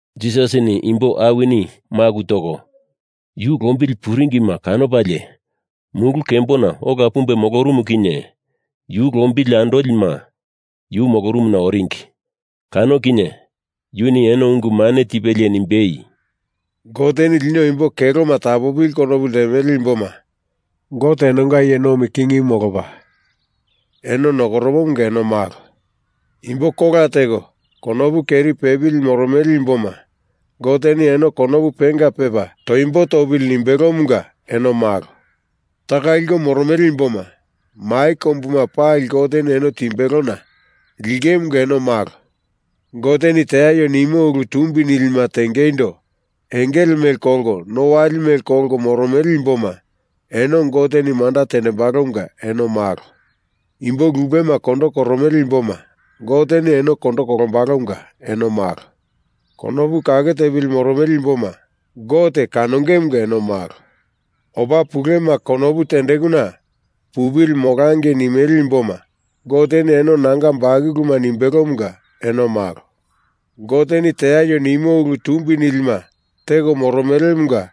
Jisasini imbo awini maku toko yu lombili puringima kanopalie mulu kembona ola pumbe molorumu kinye yu lombili andolima yu molorumuna oringi. Kano kinye yuni eno ungu mane tipelie nimbei, “Goteni lino imbo keloma tapopili konopu ltemele imboma, Gote enonga iye nomi kingimu molopa eno nokoromomunga eno malo. Imbo kola teko konopu keri pepili moromele imboma, Goteni eno konopu penga pepa toimbo topili nimbelomunga eno malo. Taka liko moromele imboma, mai kombuma pali Goteni eno timbelona lingemunga eno malo. Goteni teaio nimo ulu tumbi nilima tengeindo engele mele kolko no wali mele kolko moromele imboma, eno Goteni manda tendembalomunga eno malo. Imbo lupema kondo koromele imboma, Goteni eno kondo kolombalomunga eno malo. Konopu kake tepili moromele imboma, Gote kanongemunga eno malo. Opa pulema konopu tendekuna pupili molangei nimele imboma, Goteni eno nanga bakuluma nimbelomunga eno malo. Goteni teaio nimo ulu tumbi nilima teko moromelemunga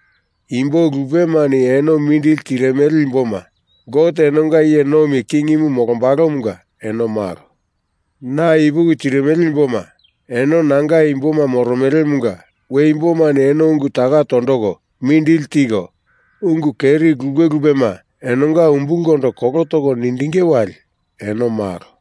imbo lupemani eno mindili tirimele imboma, Gote enonga iye nomi kingimu molombalomunga eno malo. Na ipuki tirimele imboma, eno nanga imboma moromelemunga we imbomani eno ungu taka tondoko mindili tiko, ungu keri lupe lupema enonga umbulkondo kolo toko nindinge wali, eno malo.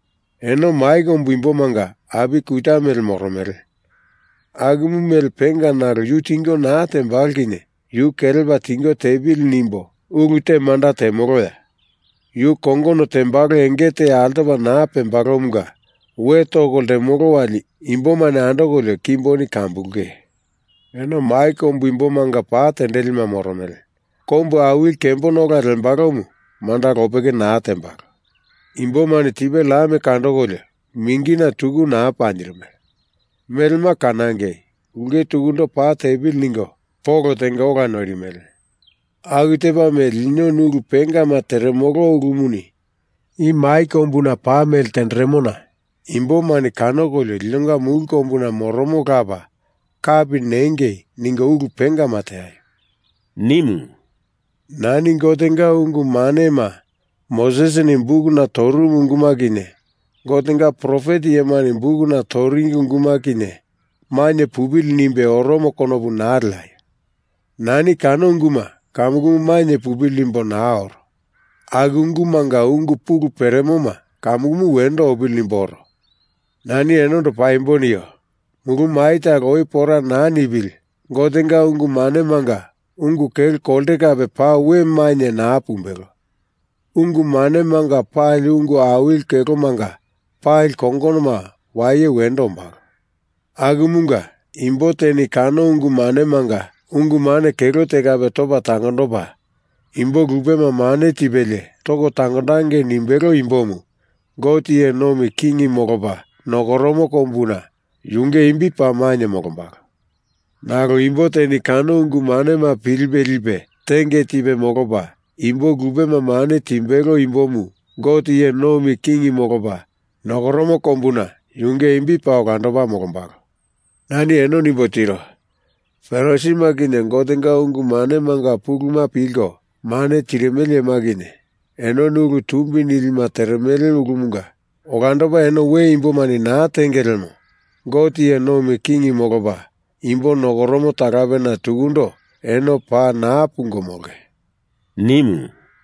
“Eno mai kombuna imbomanga api kuta mele moromele. Akumu mele penga nalo yu tingo naa tembalo kinye yu kelepa tingo tepili nimbo ulu te manda temoloya? Yu kongono tembalo enge te altopa naa pembalomunga we toko ltemolo wali imbomani andokolio kimboni kambulunge. Eno mai kombuna imbomanga pa tendelima moromele. Kombu awili kembona ola lembalomu manda lopeke naa tembalo. Imbomani tipe lam kandokolio mingina tuku naa panjirimele. Melema kanangei, ulke tukundo pa tepili ningo polo tenga ola noirimele. Aku tepa mele linoni ulu pengama teremolo ulumuni i mai kombuna pa mele tenderemona imbomani kanokolio linonga mulu kombuna moromo Lapa kapi nengei ningo ulu pengama teaio,” nimu. “Nani Gotenga ungu manema Mosesini bukuna torumu unguma kinye Gotenga profet iyemani bukuna toringi unguma kinye mainye pupili nimbe oromo konopu naa leaio! Nani kano unguma kamukumu mainye pupili nimbo naa oro. Aku ungumanga ungu pulu peremoma kamukumu wendo opili nimbo oro. Nani enondo paimbo nio. Mulu mai talo oi pora naa nipili Gotenga ungu manemanga ungu kelo kolte kape paa we mainye naa pumbelo. Ungu manemanga pali ungu awili kelomanga pali kongonoma waye wendo ombalo. Akumunga, imbo teni kano ungu manemanga ungu mane kelo te kape topa tangondopa, imbo lupema mane tipelie toko tangondangei nimbelo imbomu Gote iye nomi king molopa nokoromo kombuna yunge imbi paa mainye molombalo. Nalo imbo teni kano ungu manema pilipe lipe tenge tipe molopa, imbo lupema mane timbelo imbomu Gote iye nomi king molopa nokoromo kombuna yunge imbi paa olandopa molombalo. Nani eno nimbo tiro. Farisima kinye Gotenga ungu manemanga puluma pilko mane tirimele iyema kinye enoni ulu tumbi nilima teremele ulumanga olandopa eno we imbomani naa tenge lemo, Gote iye nomi king molopa imbo nokoromo talapena tukundo eno paa naa pungo molonge,” nimu.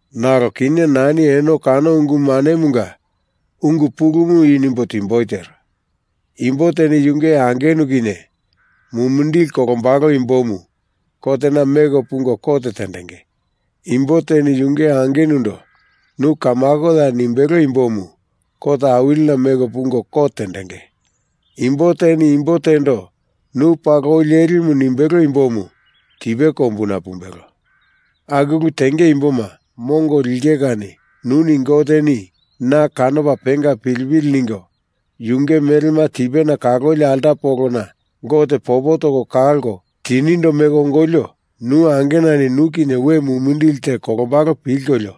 Nalo kinye nani eno kano ungu manemunga ungu pulumu i nimbo timboi tero. Imbo teni yunge angenu kinye mumindili kolombalo imbomu kotena meko pungo kot tendenge. Imbo teni yunge angenundo nu kamakoya nimbelo imbomu kot awilina meko pungo kot tendenge. Imbo teni imbo tendo nu paa loi lelimu nimbelo imbomu tipe kombuna pumbelo. Aku ulu tenge imboma mongo linge kani nuni Goteni na kanopa penga pilipili ningo yunge melema tipena kaloli alta polona Gote popo toko kalko tinindo meko ongolio nu angenani nu kinye we mumindili te kolombalo pilkolio,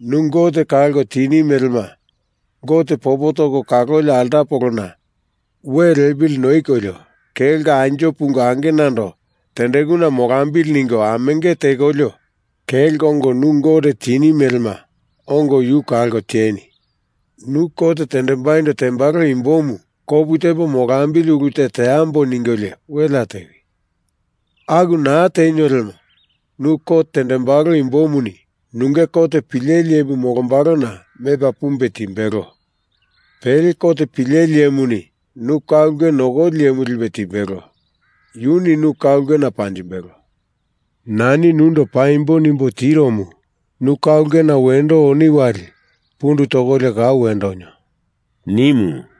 nu Gote kalko tini melema Gote popo toko kaloli alta polona we lepili noikolio kelko anjo pungo angenando tendekuna molambili ningo amenge tekolio, kelko ongo nu Gote kaloni melema ongo yu kalko tieni. Nu kot tendembai tembalo imbomu kopu tepo molambili ulu te teambo ningolio welea tewi. Aku naa tenio lemo nu kot tendembalo imbomuni nunge kot pileli iyemu molombalona mepa pumbe timbelo. Pele kot pileli iyemuni nu ka ulke nokoli iyemu lipe timbelo, yuni nu ka ulkena panjimbelo. Nani nundo paimbo nimbo tiromu, nu ka ulkena wendo oni wali pundu tokolio kau wendo onio,” nimu.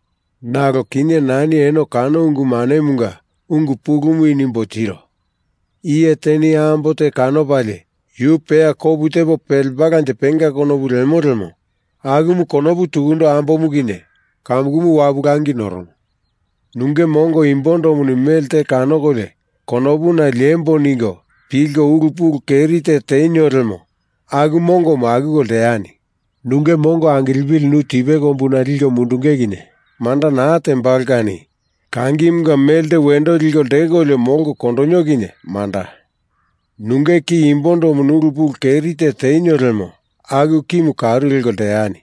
Nalo kinye nani eno kano ungu manemunga ungu pulumu i nimboi tiro. Iye teni ambo te kanopalie yu peya kopu tepo pelembalanje penga konopu lemo lemo akumu konopu tukundo, ambomu kinye kamukumu wapu langi noromo. Nunge mongo imbondomuni melte kanokolio konopuna liemboa ningo pilko ulu pulu keri te tenio lemo aku mongomu akuko lteani. Nunge mongo angilepili nu tipe kombuna liko mundunge kinye manda naa tembalo kani kangimunga melte wendo liko ltekolio molko kondonio kinye manda. Nunge ki imbondomuni ulu pulu keri te tenio lemo aku kimu karu leko lteani.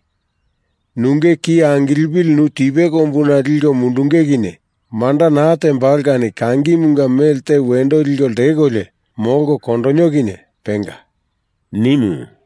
Nunge ki angilipili nu tipe kombuna liko mundunge kinye manda naa tembalo kani kangimunga melte wendo liko ltekolio molko kondonio kinye penga,” nimu.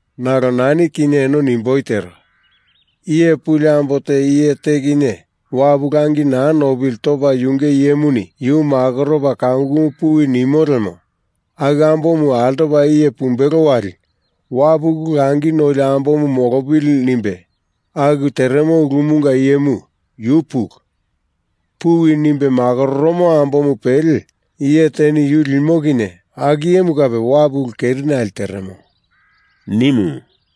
Nalo nani kinye eno nimboi tero. Iye puli ambo te iye te kinye wapu langi naa nopili topa yunge iyemuni yu makoropa kamukumu puwi nimo lemo aku ambomu altopa iye pumbelo wali, wapu ulu langi noli ambomu molopili nimbe aku teremo ulumunga iyemu, yu pulu. Puwi nimbe makororomo ambomu pele iye teni yu limo kinye aku iyemu kape wapu ulu kerinale teremo,” nimu.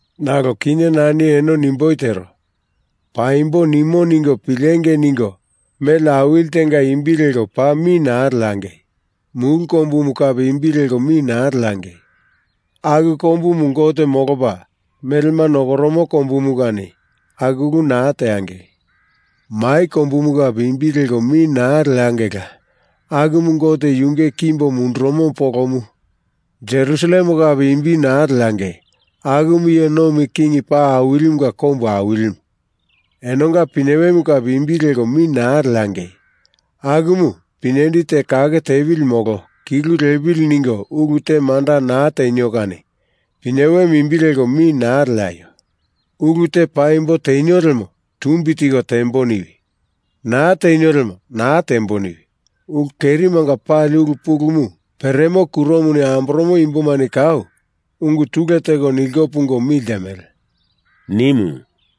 Nalo kinye nani eno nimboi tero. Paimbo nimo ningo pilengei ningo mele awili tenga imbi leko paa mi naa leangei. Mulu kombumu kape imbi leko mi naa leangei. Aku kombumu Gote molopa melema nokoromo kombumu kani aku ulu naa teangei. Mai kombumu kape imbi leko mi naa leangeila. Akumu Gote yunge kimbo mundurumo polomu. Jerusalem kape imbi naa leangei. Akumu iye nomi king paa awilimunga kombu awilimu. Enonga pinyewe kape imbi leko mi naa leangei. Akumu pinyendi te kake tepili molo kilu lepili ningo ulu te manda naa tenio kani pinyewemu imbi leko mi naa leaio. Ulu te paimbo tenio lemo tumbi tiko tembo niwi. Naa tenio lemo naa tembo niwi. Ulu kerimanga pali ulu pulumu peremo kuromuni amboromo imbomani kau ungu tule teko niliko pungo mi ltemele,” nimu.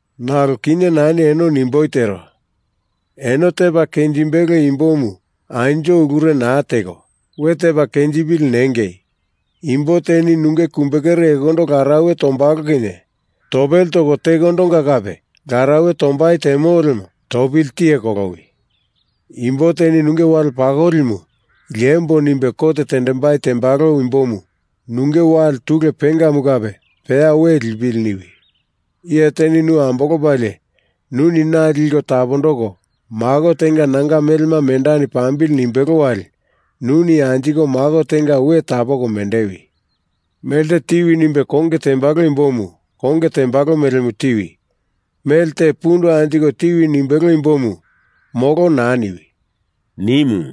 Nalo kinye nani eno i nimboi tero. Eno tepa kenjimbelo imbomu anjo ulure naa teko, we tepa kenjipili nengei. Imbo teni nunge kumbekere ekondonga larauwe tombalo kinye topele toko tekondonga kape larauwe tombai temo lemo topili tiye kolowi. Imbo teni nunge wale pakolimu liembo nimbe kot tendembai tembalo imbomu nunge wale tule pengamu kape peya we lipili niwi. Iye teni nu ambolopalie nuni na liko tapondoko mako tenga nanga melema mendani pambili nimbelo wali nuni anjiko mako tenga we tapoko mendewi. Melte tiwi nimbe konge tembalo imbomu konge tembalo melemu tiwi. Mele te pundu anjiko tiwi nimbelo imbomu molo naa niwi,” nimu.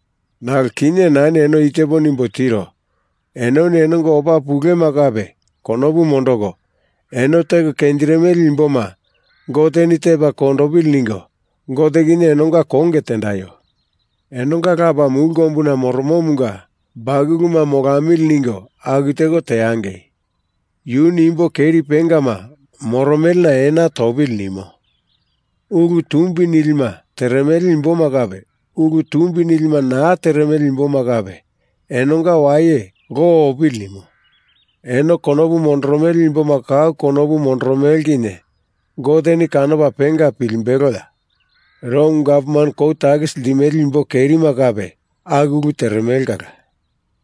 Nalo kinye nani eno i tepo nimbo tiro. Enoni enonga opa pulema kape konopu mondoko, eno teko kenjirimele imboma Goteni tepa kondopili ningo Gote kinye enonga konge tendaio. Enonga Lapa mulu kombuna moromomunga bakuluma molamili ningo aku teko teangei. Yuni imbo keri pengama moromelena ena topili nimo. Ulu tumbi nilima teremele imboma kape ulu tumbi nilima naa teremele imboma kape enonga waye lo opili nimo. Eno konopu mondoromele imboma kau konopu mondoromele kinye Goteni kanopa penga pilimbeloya? Rom gavman kou takisi limele imbo kerima kape aku ulu teremele kala.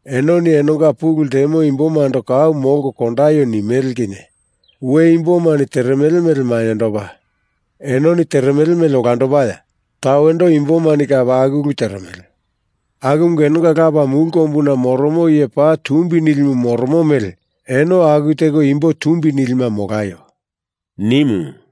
Enoni enonga pulu ltemo imbomando kau molko kondaio nimele kinye we imbomani teremele mele mainyendopa, enoni teremele mele olandopaya? Tawendo imbomani kape aku ulu teremele. Akumunga enonga Lapa mulu kombuna moromo iye paa tumbi nilimu moromo mele eno aku teko imbo tumbi nilima molaio,” nimu.